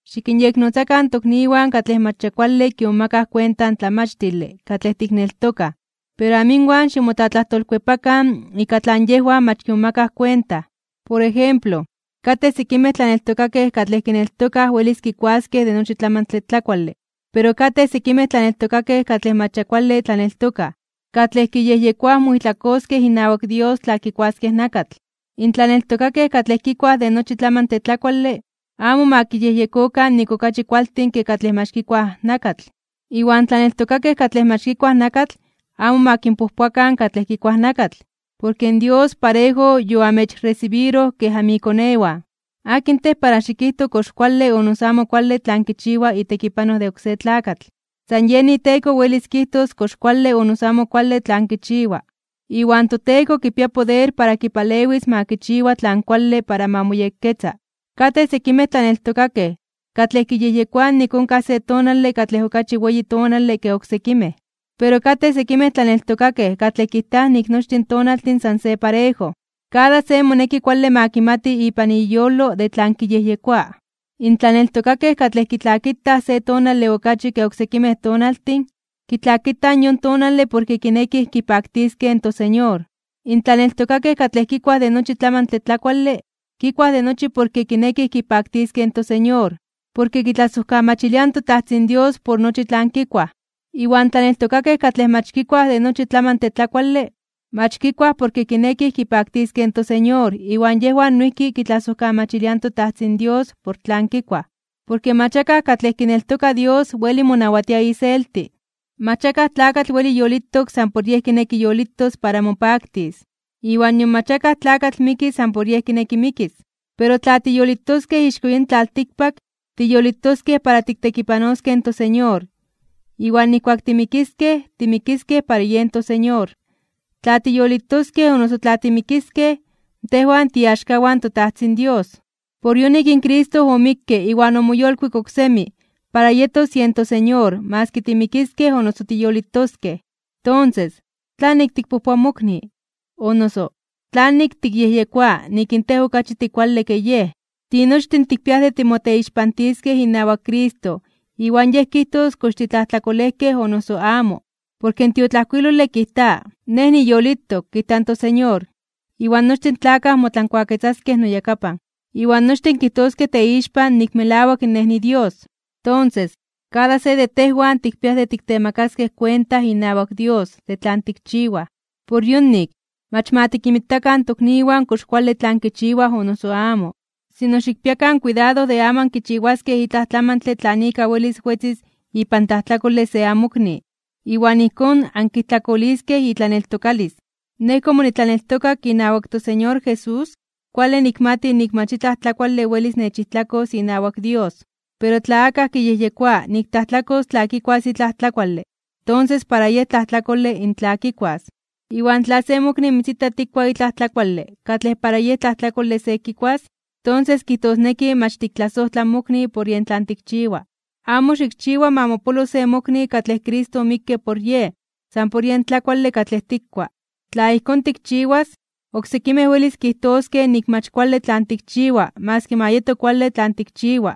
Xikinyeknotzakan in tokniwan katlej mach ya kuale kimomakaj kuenta in tlamachtile katlej tikneltokaj. Pero amo inwan ximotlatlajtolkuepakan ika tlan yejwan mach kimomakaj kuenta. Por ejemplo, katej sekimej tlaneltokakej katlej kineltokaj welis kikuaskej de nochi tlamantle tlakuale, pero katej sekimej tlaneltokakej katlej mach ya kuale tlaneltokaj, katlej kiyejyekoaj moijtlakoskej inawak Dios tla kikuaskej nakatl. In tlaneltokakej katlej kikuaj de nochi tlamantle tlakuale, amo ma kiyejyekokan nik okachi kualtin ke katlej mach kikuaj nakatl. Iwan tlaneltokakej katlej mach kikuaj nakatl amo ma kinpojpoakan katlej kikuaj nakatl, porke Dios parejo yoamechresibiroj kej anmikonewan. ¿Akin tej para xikijto kox kuale o noso amo kuale tlan kichiwa itekipanoj de oksé tlakatl? San yen iteko welis kijtos kox kuale o noso amo kuale tlan kichiwa. Iwan toTeko kipia poder para kipalewis ma kichiwa tlan kuale para ma moyekketza. Katej sekimej tlaneltokakej katlej kiyejyekoaj nik onkaj se tonale katlej okachi weyi tonale ke oksekimej tonaltin. Pero katej oksekimej tlaneltokakej katlej kijtaj nik nochtin tonaltin san se parejo. Kada se moneki kuale ma kimati ipan iyolo de tlan kiyejyekoa. In tlaneltokakej katlej kitlakitaj se tonale okachi ke oksekimej tonaltin, kitlakitaj yon tonale porke kinekij kipaktiskej in toSeñor. In tlaneltokakej katlej kikuaj de nochi tlamantle tlakuale, kikuaj de nochi porke kinekij kipaktiskej in toSeñor porke kitlasojkamachiliaj in toTajtzin Dios por nochi tlan kikuaj. Iwan tlaneltokakej katlej mach kikuaj de nochi tlamantle tlakuale, mach kikuaj porke kinekij kipaktiskej in toSeñor iwan yejwan noijki kitlasojkamachiliaj in toTajtzin Dios por tlan kikuaj. Porke mach akaj katlej kineltoka Dios weli monawatia iselti. Mach akaj tlakatl weli yolitok san por yej kineki yolitos para mopaktis, iwan nion mach akaj tlakatl miki san por yej kineki mikis. Pero tla tiyolitokej ixko yin tlaltikpak, tiyolitokej para tiktekipanoskej in toSeñor, iwan nijkuak timikiskej, timikiskej para yen toSeñor. Tla tiyolitoskej o noso tla timikiskej, tejwan tiiaxkawan toTajtzin Dios. Por yonik in Cristo omikke iwan omoyolkuik oksemi para yetos yen toSeñor maski timikiskej o noso tiyolitoskej. Tonses, ¿tlanik tikpojpoa in mokni? O noso, ¿tlanik tikyejyekoa nik in tej okachi tikuale ke yej? Tinochtin tikpiaj de timoteixpantiskej inawak Cristo iwan Yej kijtos kox titlajtlakolejkej o noso amo. Porke in tiotlajkuilole kijta: Nej niyolitok, kijta in toSeñor, iwan nochtin tlakaj motlankuaketzaskej noyakapan, iwan nochtin kijtoskej teixpan nik melawak Nej niDios. Tonses, kada se de tejwan tikpiaj de tiktemakaskej kuenta inawak Dios de tlan tikchiwaj. Por yonik, mach ma tikinmitakan in tokniwan kox kuale tlan kichiwaj o noso amo. Sino, xikpiakan kuidado de amo ankichiwaskej itlaj tlamantle tlan ika welis wetzis ipan tlajtlakole se amokni, iwan ijkón ankijtlakoliskej itlaneltokalis. Nej komo nitlaneltokak inawak toSeñor Jesús, kuale nikmati nik mach itlaj tlakuale welis techijtlakos inawak Dios. Pero tla akaj kiyejyekoa nik tlajtlakos tla kikuas itlaj tlakuale, tonses para yej tlajtlakole in tla kikuas. Iwan tla se mokni mitzita tikkua itlaj tlakuale katlej para yej tlajtlakole se kikuas, tonses kijtosneki mach tiktlasojtla in mokni por yen tlan tikchiwa. Amo xikchiwa ma mopolo se mokni katlej Cristo omikke por yej, san por yen tlakuale katlej tikkua. Tla ijkón tikchiwas, oksekimej welis kijtoskej nik mach kuale tlan tikchiwa maski ma yeto kuale tlan tikchiwa.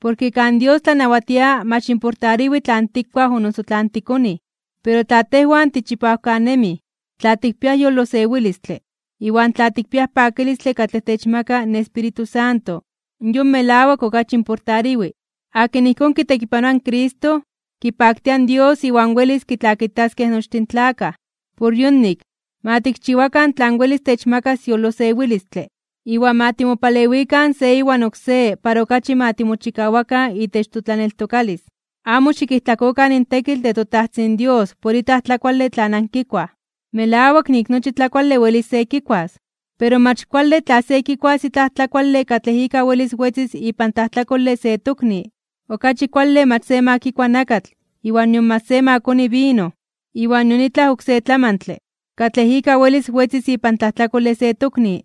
Porke kan Dios tlanawatia mach importariwi tlan tikuaj o noso tlan tikonij. Pero tla tejwan tichipawkanemij, tla tikpiaj yolosewilistle, iwan tla tikpiaj pakilistle katlej techmaka in Espíritu Santo, yon melawak okachi importariwi. Akin ijkón kitekipanoa in Cristo, kipaktia in Dios iwan welis kitlakitaskej nochtin tlakaj. Por yonik, ma tikchiwakan tlan welis techmakas yolosewilistle, iwan ma timopalewikan se iwan oksé para okachi ma timochikawakan itech totlaneltokalis. Amo xikijtlakokan in tekitl de toTajtzin Dios por itlaj tlakuale tlan ankikuaj. Melawak nik nochi tlakuale welis se kikuas, pero mach kuale tla se kikuas itlaj tlakuale katlej ika welis wetzis ipan tlajtlakole se tokni. Okachi kuale mach ma se kikua nakatl iwan nion mach ma se koni vino, iwan nion itlaj oksé tlamantle, katlej ika welis wetzis ipan tlajtlakole se tokni.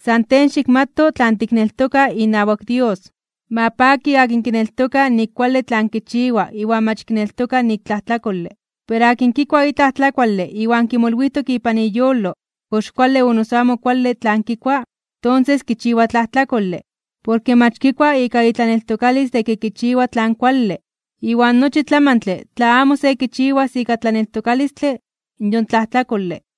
San tej xikmato tlan tikneltoka inawak Dios. Ma paki akin kineltoka nik kuale tlan kichiwa iwan mach kineltoka nik tlajtlakole. Pero akin kikua itlaj tlakuale iwan kimolwijtok ipan iyolo kox kuale o noso amo kuale tlan kikua, tonses kichiwa tlajtlakole. Porke mach kikua ika itlaneltokalis de ke kichiwa tlan kuale. Iwan nochi tlamantle tla amo se kichiwas ika tlaneltokalistle, yon tlajtlakole.